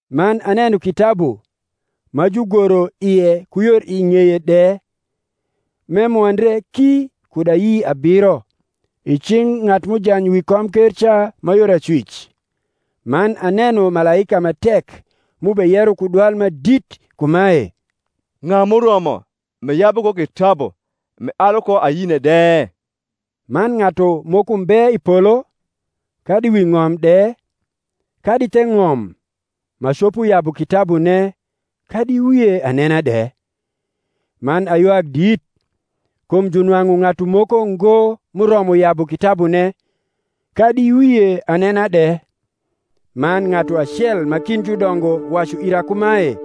Man aneno kitabu, ma jugoro ie ku yor i ng’eye de, m’emwondre ki kud ayi abiro, i cing’ ng’atu m’ujany wi komker ca ma yor acwic. Man aneno malaika ma tek m’ubeyero ku dwal ma dit kumae, Ng’a m’uromo m’eyabu ko kitabu, m’ealu ko ayine de? Man ng’atu moko mbe i polo, kadi wi ng’om de, kadi the ng’om, ma copo yabu kitabune, kadi wie anena de. Man aywak dit, kum junwang’u ng’atu moko ngo m’uromo yabu kitabune, kadi wie anena de: man ng’atu acel ma kind judongo wacu ira kumae,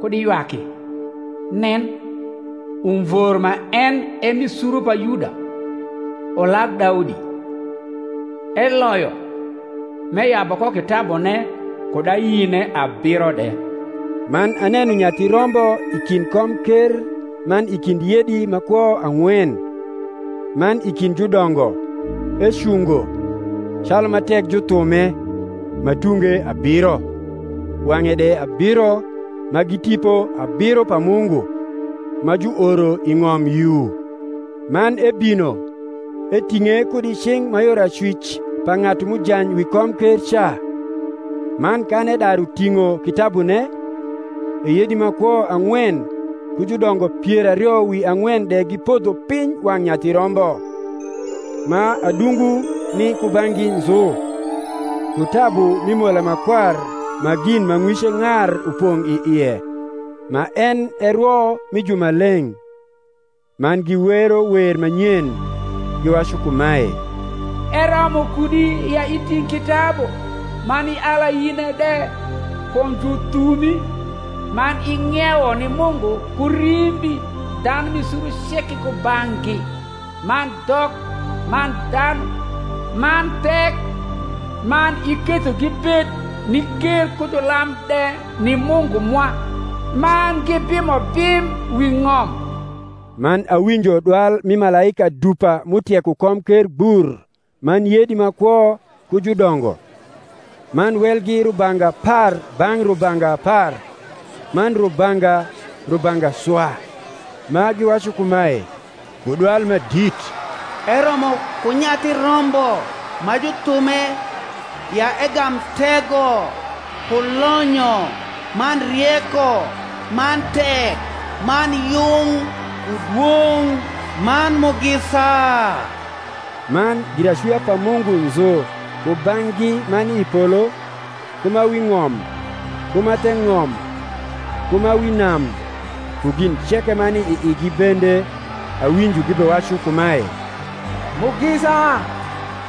Kud iywaki: nen, Umvor ma en e mi suru pa Yuda, Ulag Daudi, eloyo m’eyabu ko kitabune kud ayine abiro de. Man aneno Nyathi Rombo i kind komker man i kind yedi ma kwo ang’wen, man i kind judongo, ecungo, calu ma tek juthume, ma tunge abiro, wang’e de abiro ma gi Tipo abiro pa Mungu, ma juoro i ng’om yu. Man ebino, eting’e kud i cing’ ma yor acwic pa ng’atu m’ujany wi komker ca. Man kan edaru ting’o kitabune, e yedi ma kwo ang’wen ku judongo pier ario wi ang’wen de gipodho piny wang’ Nyathi Rombo, ma adungu ni kubang’gi nzu, ku tabu mi mola ma kwar ma gin ma ng’wice ng’ar upong’ i ie, ma en e rwo mi jumaleng’. Man giwero wer ma nyen, giwacu kumae, Eromo kudi ya iting’ kitabu, man ial ayine de: kum juthumi,man ing’iewo ni Mungu ku rimbi dhanu mi suru ceke kubang’gi, man dhok, man dhanu, man thek, man iketho gibed ni ker ku julam de ni Mungu mwa; man gibimo bim wi ng’om. E aneno, man awinjo dwal mi malaika dupa m’utieko komker gbur man yedi ma kwo ku judongo; man welgi rubanga apar bang’ rubanga apar, man rubanga rubanga swa; ma giwacu kumae, ku dwal ma dit, Eromo ku Nyathi Rombo ma juthume ya egam tego, ku lonyo, man rieko, man tek, man yung, ku dwong’, man mugisa. Man giracwia pa Mungu nzu kubang’gi ma ni i polo, ku ma wi ng’om, ku ma the ng’om, ku ma wi nam, ku gin ceke ma ni i igi bende, awinjo gibewacu kumae, Mugisa,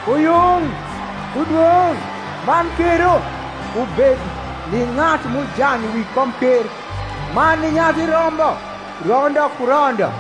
ku yung, ku dwong’, man kero, ubed ni ng’atu m’ujany wi komker, man ni Nyathi Rombo, rondo ku rondo.